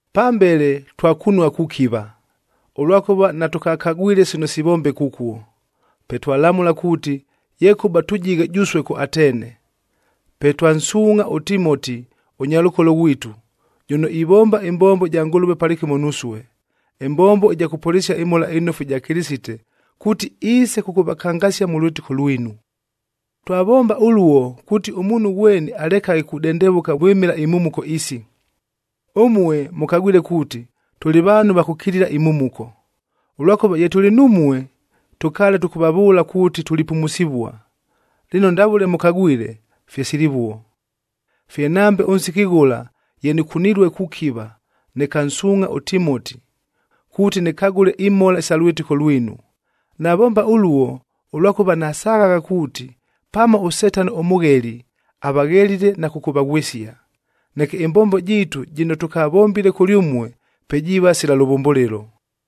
Pambele twakunua kukiva, ʉlwakʉva natʉkakagwile sino sivombeka ʉkuo. Pe twalamʉla kuuti, yekʉba tʉjighe jʉsue kʉ Atene. Pe twansuungʼha ʉTimoti ʉnyalʉkolo ghwitu, jʉno ivomba ɨmbombo ɨja Ngʉlʉve palɨkɨmo nusue, ɨmbombo ɨja kʉpʉlɨsia ɨMhola ɨNofu ɨja Kɨlɨsite, kuuti iise kʉkʉvakangasia mʉ lwɨtɨko lwinu. Twavomba ʉluo, kuuti ʉmuunhu ghweni alekaghe kudendevʉka vwɨmɨla imhumuko isi. Ʉmue mʉkagwile kuuti, tʉlɨ vaanhu va kʉkilila imhumuko. Ʉlwakʉva ye tʉlɨ numue, tʉkaale tʉkʉvavʉʉla kuuti tulipumusivua, lɨno ndavʉle mʉkagwile, fye silivuo. Fye nambe ʉnsiki ghʉla ye nɨkunilue kukiva, nɨkansuungʼha ʉTimoti, kuuti nɨkagʉle imhola isa lwɨtɨko lwinu. Navomba ʉluo, ʉlwakʉva nasaghagha kuuti, pamo ʉSetano ʉmʉgheli, avaghelile na kʉkʉvaghwɨsia. Neke ɨmbombo jiitu jɨno tʉkavombile kʉlyʉmue, pe jiiva sila lʉvʉmbʉlɨlo.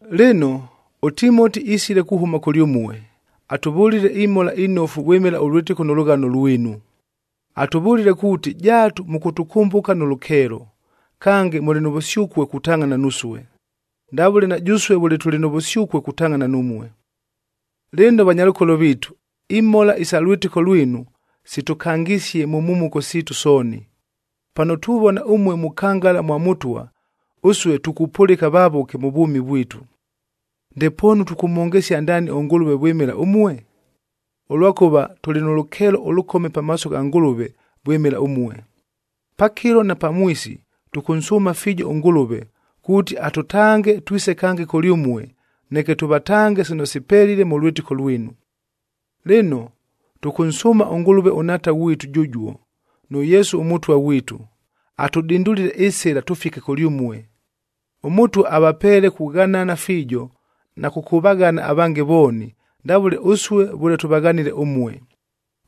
Lɨno, ʉTimoti isile kuhʉma kʉlyʉmue, atʉvʉlile imhola inofu vwɨmɨla ʉlwɨtɨko nʉ lʉghano lwinu. Atʉvʉlile kuuti jaatu mʉkʉtʉkʉmbʉka nʉ lʉkeelo, kange mʉlɨ nʉ vʉsyʉkue kutangʼhana nusue, ndavʉle na jʉsue vʉle tʉlɨ nʉ vʉsyʉkue kutangʼhana numue. Lɨno vanyalʉkolo viitu, imhola isa lwɨtɨko lwinu, sitʉkangisie mʉ mhumuko siitu sooni. Pano tuvona ʉmue mukangala mwa Mʉtwa, ʉsue tukupʉlɨka vavʉke mʉ vwʉmi vwitu. Ndepoonu tʉkʉmhongesia ndaani ʉNgʉlʉve vwɨmɨla ʉmue? Ʉlwakʉva tʉlɨ nʉ lʉkeelo ʉlʉkome pamaaso gha Ngʉlʉve vwɨmɨla ʉmue. Pakɨlo na pamwisi tʉkʉnsʉʉma fiijo ʉNgʉlʉve, kuuti atʉtange twise kange kʉlyʉmue, neke tʉvatange sino sipelile mʉ lwɨtɨko lwinu. Lɨno, tʉkʉnsʉʉma ʉNgʉlʉve ʉNhaata ghwitu jʉjuo, nʉ Yesu ʉMʉtwa ghwitu, atʉdindulile ɨsɨla tʉfike kʉlyʉmue. ɄMʉtwa avapeele kughanana fiijo, na kʉkʉvaghana avange vooni, ndavʉle ʉsue vʉle tʉvaghanile ʉmue.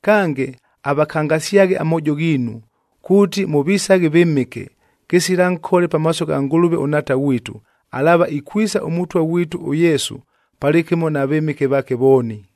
Kange, avakangasyaghe amoojo ghiinu, kuuti mʉvisaghe vɨmɨke, kɨsila nkole pamaaso gha Ngʉlʉve ʉNhaata ghwitu, alaava ikwisa ʉMʉtwa ghwitu ʉYesu palɨkɨmo na vɨmɨke vaake vooni.